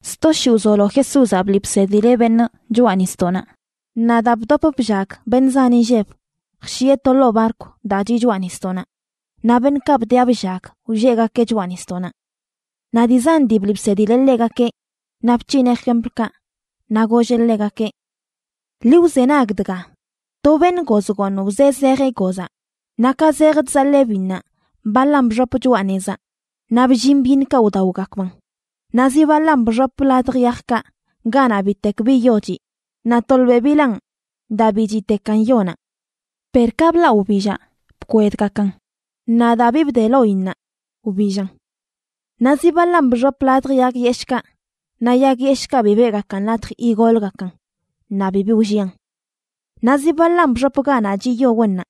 Sto shii wzolo Jesúzaꞌ bliꞌ bsedileꞌ beṉꞌ choꞌa nisdoꞌnaꞌ, naꞌ daa bdop bllag beṉꞌ zan inlleb jshieꞌ to ḻoo barkw daa chiꞌ choꞌa nisdoꞌnaꞌ, naꞌ beṉꞌkaꞌ bdiꞌa bllag wlleꞌgakeꞌ choꞌa nisdoꞌnaꞌ. Naꞌ dii zan dii bliꞌ bsedileꞌ ḻegakeꞌ naꞌ bc̱hineꞌ jemplkaꞌ, naꞌ golleꞌ ḻegakeꞌ: ―Ḻi wzenag dga. To beṉꞌ goz gooṉ wzee zejeꞌ gozaꞌ. Naꞌ ka zej chzaḻee biṉnaꞌ, baḻan bxop choꞌa nezaꞌ naꞌ bllin byiṉkaꞌ wdaogakban. Naꞌ zi baḻan bxop ladj yajkaꞌ, ganaꞌ bitek bi yo chiꞌ. Naꞌ tolbeꞌ bilaan, daa bi chiꞌtekan yonaꞌ. Per ka blaꞌ wbillaꞌ, bkwedgakan. Naꞌ daa bi bde loinnaꞌ, wbillan. Naꞌ zi baḻan bxop ladj yag yeshꞌkaꞌ naꞌ yag yeshꞌkaꞌ bi beꞌgakan latj igolgakan naꞌ bibi wllian. Naꞌ zi baḻan bxop ganaꞌ chiꞌ yo wennaꞌ,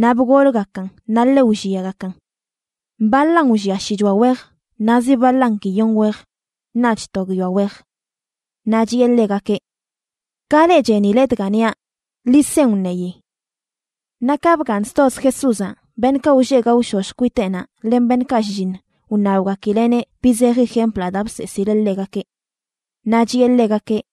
naꞌ bgolgakan naꞌ ḻe wlliagakan. Baḻan wllia shichoa wej, naꞌ zi baḻan guiyon wej, naꞌch to guiyoa wej. Naꞌ chiꞌe ḻegakeꞌ: ―Ka leꞌ chenile dga niaꞌ, ḻi sen wṉeyi. Naꞌ ka bgaaṉ stoz Jesúzaꞌ, beṉꞌkaꞌ wlleꞌ gaoshosh kwiteꞌnaꞌ len beṉꞌkaꞌ shlliṉ, wṉabgakileꞌneꞌ bi zeji jemplaꞌ daa bseesileꞌ ḻegakeꞌ. Naꞌ chiꞌe ḻegakeꞌ: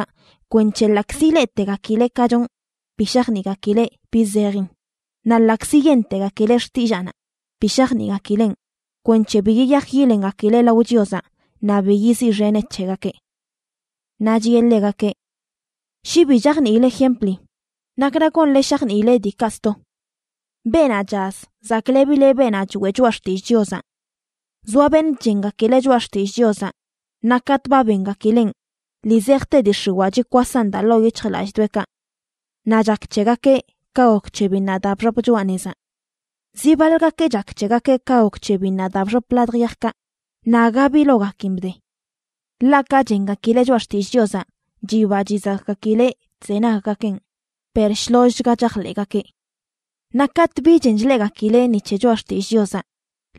kwenc̱he ḻaꞌkzi ileꞌtegakileꞌ ka chonꞌ, bi shajniꞌgakileꞌ bi zejin, naꞌ ḻaꞌkzi yentegakileꞌ xtillaanaꞌ, bi shajniꞌgakileꞌn, kwenc̱he bi yiyaj yilengakileꞌ lao Chiozaꞌ naꞌ bi yiziꞌxeneꞌ c̱hegakeꞌ. Naꞌ chiꞌe ḻegakeꞌ: ―Shi bi chajniile jempli, ¿nakra gonle shajniile diikaꞌ sto? Beenaꞌ chaz zaklebileꞌ beenaꞌ choeꞌ choꞌa xtillꞌ Chiozaꞌ. Zoa beṉꞌ chengakileꞌ choꞌa xtillꞌ Chiozaꞌ naꞌ katꞌ ba bengakileꞌn, ḻii zejte dii x̱iwaa chikwasan daa ḻoo yic̱hjlallꞌdoꞌekaꞌ. Naꞌ chak c̱hegakeꞌ ka gok c̱he biṉnaꞌ daa bxop choꞌa nezaꞌ. Zi baḻgakeꞌ chak c̱hegakeꞌ ka gok c̱he biṉnaꞌ daa bxop ladj yajkaꞌ naꞌ aga bi logakin bde. Ḻaꞌ ka chengakileꞌ choꞌa xtill Chiozaꞌ chiba chizakꞌgakileꞌ chzenaggakeꞌn per shlollchga chajḻeꞌgakeꞌ. Naꞌ katꞌ bi chen chleꞌgakileꞌ ni c̱he choꞌa xtillꞌ Chiozaꞌ,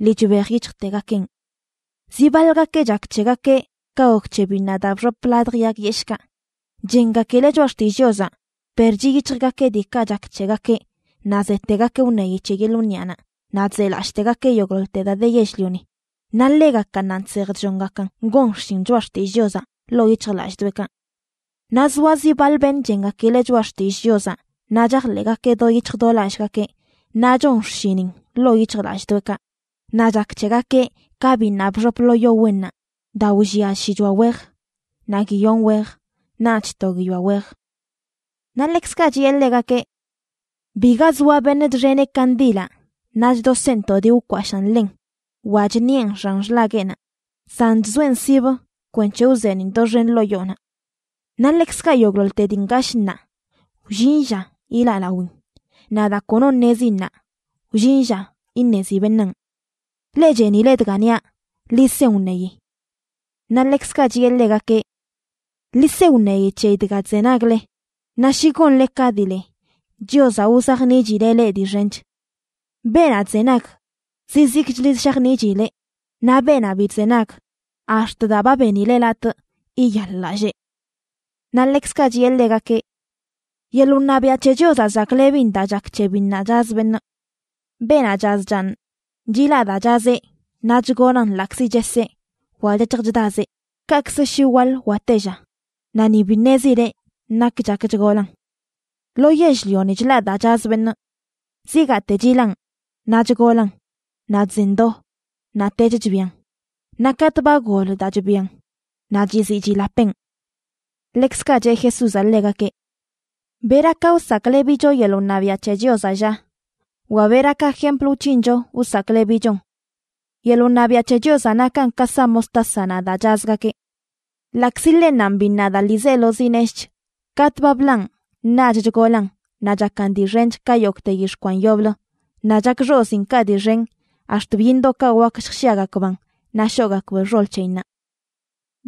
lii chbej yic̱hjtegakeꞌn. Zi baḻgakeꞌ chak c̱hegakeꞌ ka gok c̱he biṉnaꞌ daa bxop ladj yag yeshꞌkaꞌ. Chengakileꞌ choꞌa xtillꞌ Chiozaꞌ, per chiꞌ yic̱hjgakeꞌ diikaꞌ chak c̱hegakeꞌ, naꞌ zetegakeꞌ wṉeyi c̱he yeḻꞌ wniꞌanaꞌ naꞌ chzelallꞌtegakeꞌ yogꞌḻoḻte daa de yell-lioni. Naꞌ ḻegakannanꞌ chsej chllongakan gon xshin choꞌa xtillꞌ Chiozaꞌ ḻoo yic̱hjlallꞌdoꞌekaꞌ. Naꞌ zoa zi baḻ beṉꞌ chengakileꞌ choꞌa xtillꞌ Chiozaꞌ naꞌ chajḻeꞌgakeꞌ do yic̱hj do lallꞌgakeꞌ, naꞌ chon xshinin ḻoo yic̱hjlallꞌdoꞌekaꞌ. Naꞌ chak c̱hegakeꞌ ka biṉnaꞌ bxop lo yo wennaꞌ daa wllia shichoa wej, naꞌ guiyon wej naꞌch to guiyoa wej. Naꞌ ḻekzkaꞌ chiꞌe ḻegakeꞌ: ―Biga zoa beṉꞌ chxeneꞌ kandilaꞌ naꞌ chdoseꞌn to dii wkwashaan ḻen wa chṉiꞌen xan xḻagueꞌnaꞌ, san chzoeꞌn sibə kwenc̱he wzeeniꞌn doxen ḻoo yoonaꞌ. Naꞌ ḻekzkaꞌ yogꞌḻoḻte dii ngashꞌ ṉaa wllin lla yilaꞌ lawin, naꞌ daa kono ṉezi ṉaa wllin lla iṉezi beṉaan. Leꞌ chenile dga niaꞌ, ḻi sen wṉeyi. Naꞌ ḻekzkaꞌ chiꞌe ḻegakeꞌ: ―Ḻi se wṉeyi c̱heyi dga chzenagle. Naꞌ shi gonle ka dii le, Chiozaꞌ wzajniꞌchileꞌ leꞌ dii xench. Beenaꞌ chzenag, zizikchli shajniꞌchileꞌ, naꞌ beenaꞌ bi chzenag, ax̱t daa ba benileꞌ latꞌ yiyaḻ-lallee. Naꞌ ḻekzkaꞌ chiꞌe ḻegakeꞌ: ―Yeḻꞌ wṉabiaꞌ c̱he Chiozaꞌ zaklebin daa chak c̱he biṉnaꞌ chaz beṉꞌ. Beenaꞌ chaz chaaṉ, chilaꞌ daa chazeꞌ naꞌ chgolan ḻaꞌkzi cheseꞌ wa chec̱hj chdazeꞌ, kaꞌkzə shi waḻ wa tella, naꞌ ni bi ṉezileꞌ nak chak chgolan. Lo yell-lioni chlaꞌ daa chaz beṉꞌ: zigaate chilaꞌn, naꞌ chgolan, naꞌ chzen do, naꞌtech chbian. Naꞌ katꞌ ba gol daa chbian, naꞌ chiziꞌ chilapeꞌn. Ḻekzkaꞌ cheꞌ Jesúzaꞌ ḻegakeꞌ: ―¿Bera ka wsaklebicho yeḻꞌ wṉabiaꞌ c̱he Chiozaꞌ, lla? wa ¿bera ka jempl wc̱hincho wsaklebichon? Yeḻꞌ wṉabiaꞌ c̱he Chiozaꞌ nakan ka sa mostásanaꞌ daa chazgakeꞌ. Ḻaꞌkzi ḻennanꞌ biṉnaꞌ daa ḻiizelozi neshꞌch, katꞌ ba blaꞌn naꞌch chgolan naꞌ chakan dii xench ka yogꞌte yix̱ꞌ kwan yoblə, naꞌ chak xoziinkaꞌ dii xen ax̱t byiṉdoꞌkaꞌ wak lljshiagakban naꞌ shoꞌgakb xol c̱heyinnaꞌ.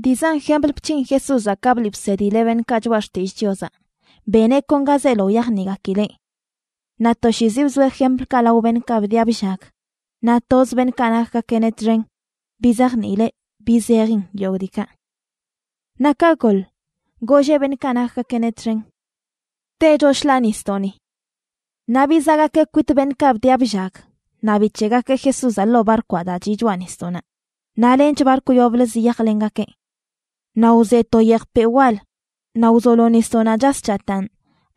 Dii zan jempl bc̱hin Jesúzaꞌ ka bliꞌ bsedileꞌ beṉꞌkaꞌ choꞌa xtillꞌ Chiozaꞌ, beneꞌ kon ga zeelo wyajniꞌgakileꞌ. Naꞌ toshiizi bzoeꞌ jemplkaꞌ lao beṉꞌkaꞌ bdiꞌa bllag, naꞌ toz beṉꞌkaꞌ nakgakeꞌneꞌ txen bizajniileꞌ bi zejin yogꞌ diikaꞌ. Naꞌ ka goḻ, golleꞌ beṉꞌkaꞌ nakgakeꞌneꞌ txen: ―Techo shḻaa nisdoꞌni. Naꞌ bizaꞌgakeꞌ kwit beṉꞌkaꞌ bdiꞌa bllag naꞌ bic̱heꞌgakeꞌ Jesúzaꞌ ḻoo barkwaꞌ daa chiꞌ choꞌa nisdoꞌnaꞌ, naꞌ lench barkw yoblə ziyajlengakeꞌ. Naꞌ wze to yejpeꞌ wal naꞌ wzolo nisdoꞌnaꞌ chas chataan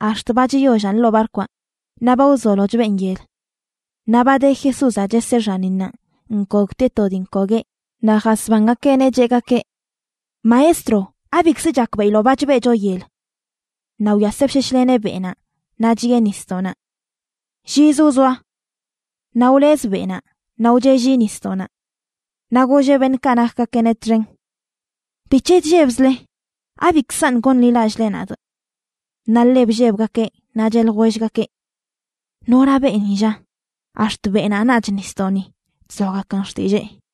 ax̱t ba chiyollan ḻoo barkwaꞌ, naꞌ ba wzolo chbeꞌn yel. Naꞌ ba de Jesúzaꞌ cheseꞌ xaninnaꞌ nkogtieꞌ to dii nkogueꞌ, naꞌ jasbangakeꞌneꞌ cheꞌgakeꞌ: ―¡Maestro! ¿Abikzə chakbeꞌiloꞌ ba chbeꞌcho yel? Naꞌ wyaseꞌ bsheshleneꞌ beꞌnaꞌ, naꞌ chiꞌe nisdoꞌnaꞌ: ―Lliz wzoa. Naꞌ wlez beꞌnaꞌ naꞌ wcheꞌlli nisdoꞌnaꞌ. Naꞌ golleꞌ beṉꞌkaꞌ nakgakeꞌneꞌ txen: ―¿Bic̱he chllebzle? ¿Abikzaṉꞌ gonḻilallꞌle nadꞌ? Naꞌ ḻe bllebgakeꞌ, naꞌ cheꞌ ljwellgakeꞌ: ―¿Nora beeni, lla?, ax̱t beꞌnaꞌ naꞌch nisdoꞌni chzoagakan xtillee.